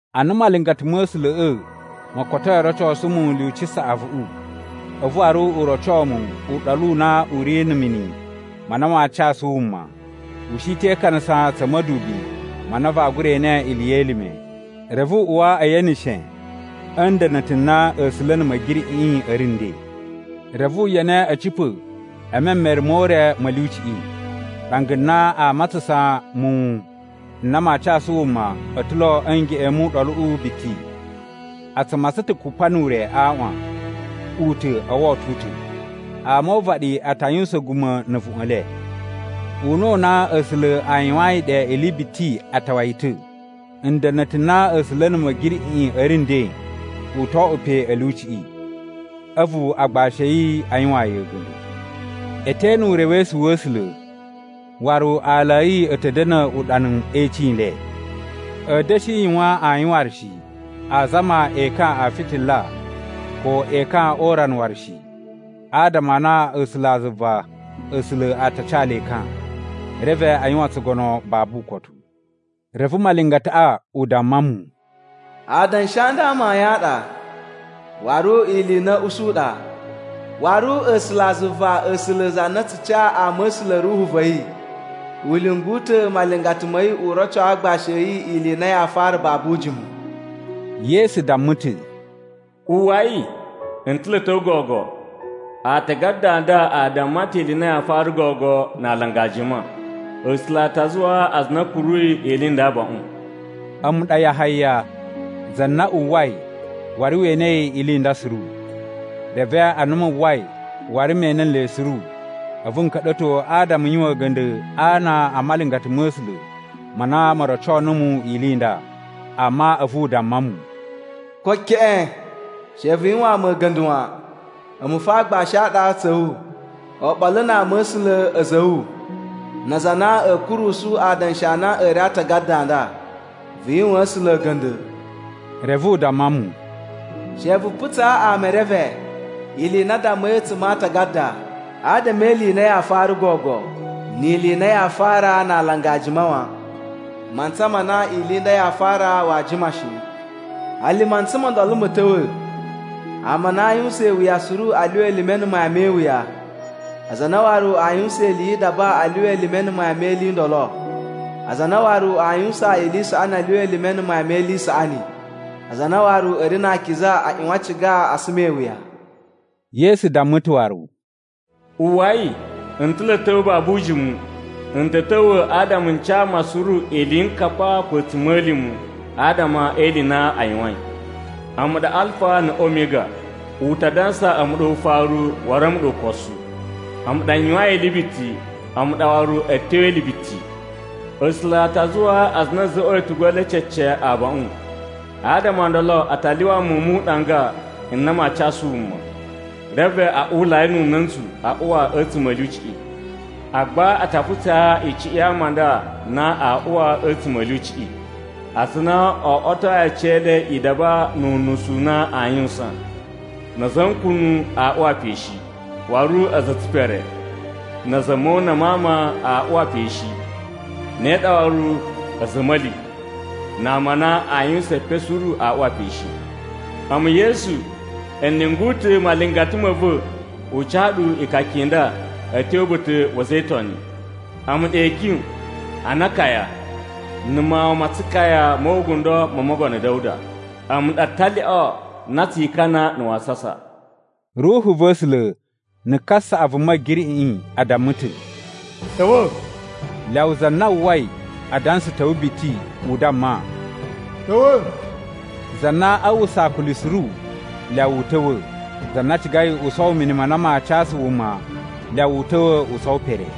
Ana malingata ma̱ A̱sula̱ꞌa̱ mo kotoi o rocosu mu lyuci saꞌavuꞌu, a̱vu waru u roco mu uɗolu u na u ri na̱ mini ma na maa casu wuma. U shi te ikanasa tsa̱ ma̱dubi ma na vaa gura ene ili ye elime. Reve u uwa e yeneshe a̱ nda̱na̱ta̱ n na A̱sula̱ na̱ Ma̱giriꞌiꞌi a̱ ri nden. Reve u yene a̱ cipa̱ e memere mo ure ma̱ lyuciꞌi. Ɗanga na aa matsasan muwun n na maa casu wuma a̱ ta̱ lo a̱ ngeꞌen mu uɗoluꞌu biti. A tsu matsan ta̱ kupa nu ure a aaꞌwan, u ta̱ o woto u ta̱. Ama o uvaɗi a ta yuwusan a̱guma̱ na̱ a̱vuꞌun e le. Una̱ u na A̱sula̱ a yuwayin ɗe ili biti a tawa yi ta̱. Nda̱na̱ta̱ n na A̱sula̱ na̱ Ma̱giriꞌiꞌi a̱ ri nden u to oꞌwo pe a̱ lyuciꞌi. A̱vu agbashi a̱ yi a yuwaan yi a̱ga̱nda̱. E te ene urewesu wa̱ A̱sula̱ waru aala a̱ yi a̱ ta̱ da̱na̱ uɗanu e icin i le. A̱a̱ da̱shi yuwan ayin waru shi. Aa zama ekan a fitila ko ekan o urana waru shi, adama a na A̱sulazuva A̱sula̱ a ta ca le ekan. Reve a yuwan tsugono babu ukotu. Reve malingataꞌa u damma mu, “Adanshi a nda amayun a ɗa, waru ili i na a̱a̱ usu ɗa. Waru A̱sulazuva A̱sula̱ za na tsu ca ama̱sula̱ Ruhu va̱ yi, u lyungu ta̱ malingata ma̱ yi u roco agbashi a̱ yi ili i na yaa fara babu ujimu.” Yesu damma ta̱, “Uwwai! N ta̱ lo a̱ ta̱wa̱ gogo. Aatagada a nda a damma ta̱ ili i na yaa fara gogo na alanga jima. A̱sula̱ a ta zuwaa aza a na a̱ kuruyi ili i nda abaꞌun.” A̱mu ɗa Yahaya, za na uwwai waru we enei ili i nda suru. Reve ana mu uwwai waru me ene nle suru, a̱vu n ka̱ɗa̱to adama n yuwan a̱ga̱nda̱ a ana a malingata ma̱ A̱sula̱ ma na mo roco numu ili i nda. Amma a̱vu u damma mu, “Ko keꞌen! She vu yuwaan mu a̱ga̱nda̱ wan! A̱mu fo aagbashi a ɗa tsa̱ wu, oɓolo na ama̱sula̱ a̱za̱ a̱ wu, na aza a na a̱a̱ kurusu adanshi a na a̱ ri a aatagada a nda. Vu yuwaan A̱sula̱ a̱ga̱nda̱!” Reve u damma mu, “She vu putsaa ama e reve ili i na a dammai a̱tsuma̱ a aatagada adama e ili i na yaa fara gogo ni ili i na yaa fara na alanga a jima wan. Mantsa ma na ili nda yaa fara waa jima shi. Hali mantsa mo ndolo ma̱ ta̱wa̱, ama a na aa yuwusan iwuya suru a lyuwa elime na̱ mayan me iwuya, aza a na waru aa yuwusan ili yi idaba a lyuwa elime na̱ mayan me ili i ndolo. Aza a na waru aa yuwusan ili i saꞌani a lyuwa elime na̱ mayan me ili i saꞌani, aza a na waru a̱ ri na akiza a ꞌyuwan a ciga a suma iwuya.” Yesu damma ta̱ waru, “Uwwai! N ta̱ lo a̱ ta̱wa̱ babu ujimu. N ta̱ ta̱wa̱ adama n ca ama suru iliyinkapa ko a̱tsuma̱lima̱ adama e ili i na a yuwain. A̱mu ɗa Alfa na̱ Omiga. U ta dansa a̱mu ɗa Ufaru waru a̱mu ɗa Ukosu. A̱mu ɗa n yuwain ili biti, a̱mu ɗa waru a̱tyo e ili biti. “A̱sula̱ a ta zuwaa aza a na a̱ za̱ꞌwa̱i a̱tugu e le cece abaꞌun, adama o ndolo a ta lyuwa muwun mu uɗanga n na maa casu wuma, reve a uwulai nu una̱ntsu a uwa a̱tsuma̱ a̱ lyuciꞌi. Agba a ta putsaa icuꞌun ya ama a nda na aa uwa a̱tsuma̱ a̱ lyuciꞌi: Aza a na o oꞌwotoi aciyele idaba nu unusu u na aa yuwusan, na̱ a̱za̱ a̱ nkunu a uwa pe shi. Waru a̱za̱ a̱ tsipere, na̱ a̱za̱ a̱ mona ma ama a uwa pe shi. Ne ɗa waru a̱za̱ a̱ a̱ma̱li, na ama a na aa yuwusan epen suru a uwa pe shi. “A̱mu Yesu, n lyungu ta̱ malingata ma̱ va̱ u ca ɗu ikaka i nda a̱ tyo uba̱ta̱ wa̱ a̱za̱ e Itoni. A̱mu ɗa Ikyun, ana Akaya, na̱ Mawun ma Tsukaya mo ugundo mo Mogono Da̱wuda. A̱mu ɗa Talyoꞌo na tsi Ikana na̱ Wasasa.” Ruhu va̱ A̱sula̱ na̱ kasaꞌavu Ma̱giriꞌiꞌi a damma ta̱, “Ta̱wa̱!” Lyawa za na uwwai adansa ta̱wa̱ biti u damma “Ta̱wa̱!” Za na aa uwwusa akuli suru, lyawa u ta̱wa̱, za na cigai u sowo mini ma na maa casu wuma lyawa u ta̱wa̱ u sowo pere.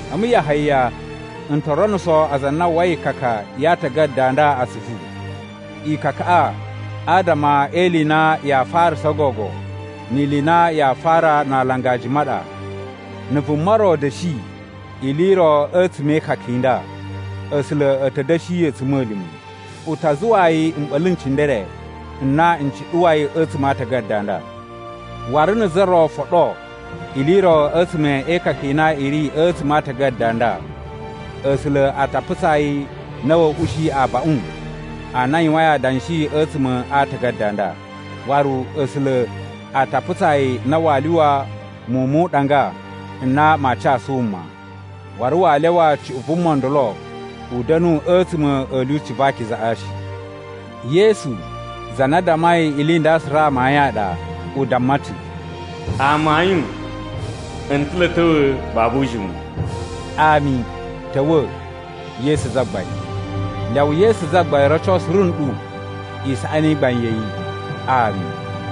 A̱mu Yahaya, n to ronuso aza a na a uwwai ikaka ya aatagada a nda atsuvu. Ikakaꞌa adama e ili i na yaa farasa gogo ni ili i na yaa fara na alanga jima ɗa. Na̱ vuma ro da̱shi ili i ro a̱tsuma̱ e ikaka i nda, A̱sula̱ a̱ ta̱ da̱shi yi a̱tsuma̱lima̱. U ta zuwaa yi mɓa̱la̱ n cindere n na n cuɗuwai a̱tsuma̱ a aatagada a nda. Waru na̱ za ro foɗo ili i ro a̱tsuma̱ e ikaka i na i ri a̱tsuma̱ a aatagada a nda, A̱sula̱ a ta putsaa yi na wa̱a̱ ushi abaꞌun a na a yuwain adanshi a̱tsuma̱ a aatagada a nda. Waru A̱sula̱ a ta putsaa yi na waa lyuwa muwun mu uɗanga n na maa casu wuma, waru waa lyawa cuꞌun vuma ndolo u da̱nu a̱tsuma̱ a̱ lyuci va akizaꞌa shi. Yesu, za na dammai ili i nda suru amayun a ɗa, u damma ta̱, “Amayun, n ta̱ lo a̱ ta̱wa̱ babu ujimu.” Ami. Ta̱wa̱, Yesu Zagbain! Lyawa Yesu Zagbain roco suru nɗu isaꞌani i gbain ya̱ yi. Ami.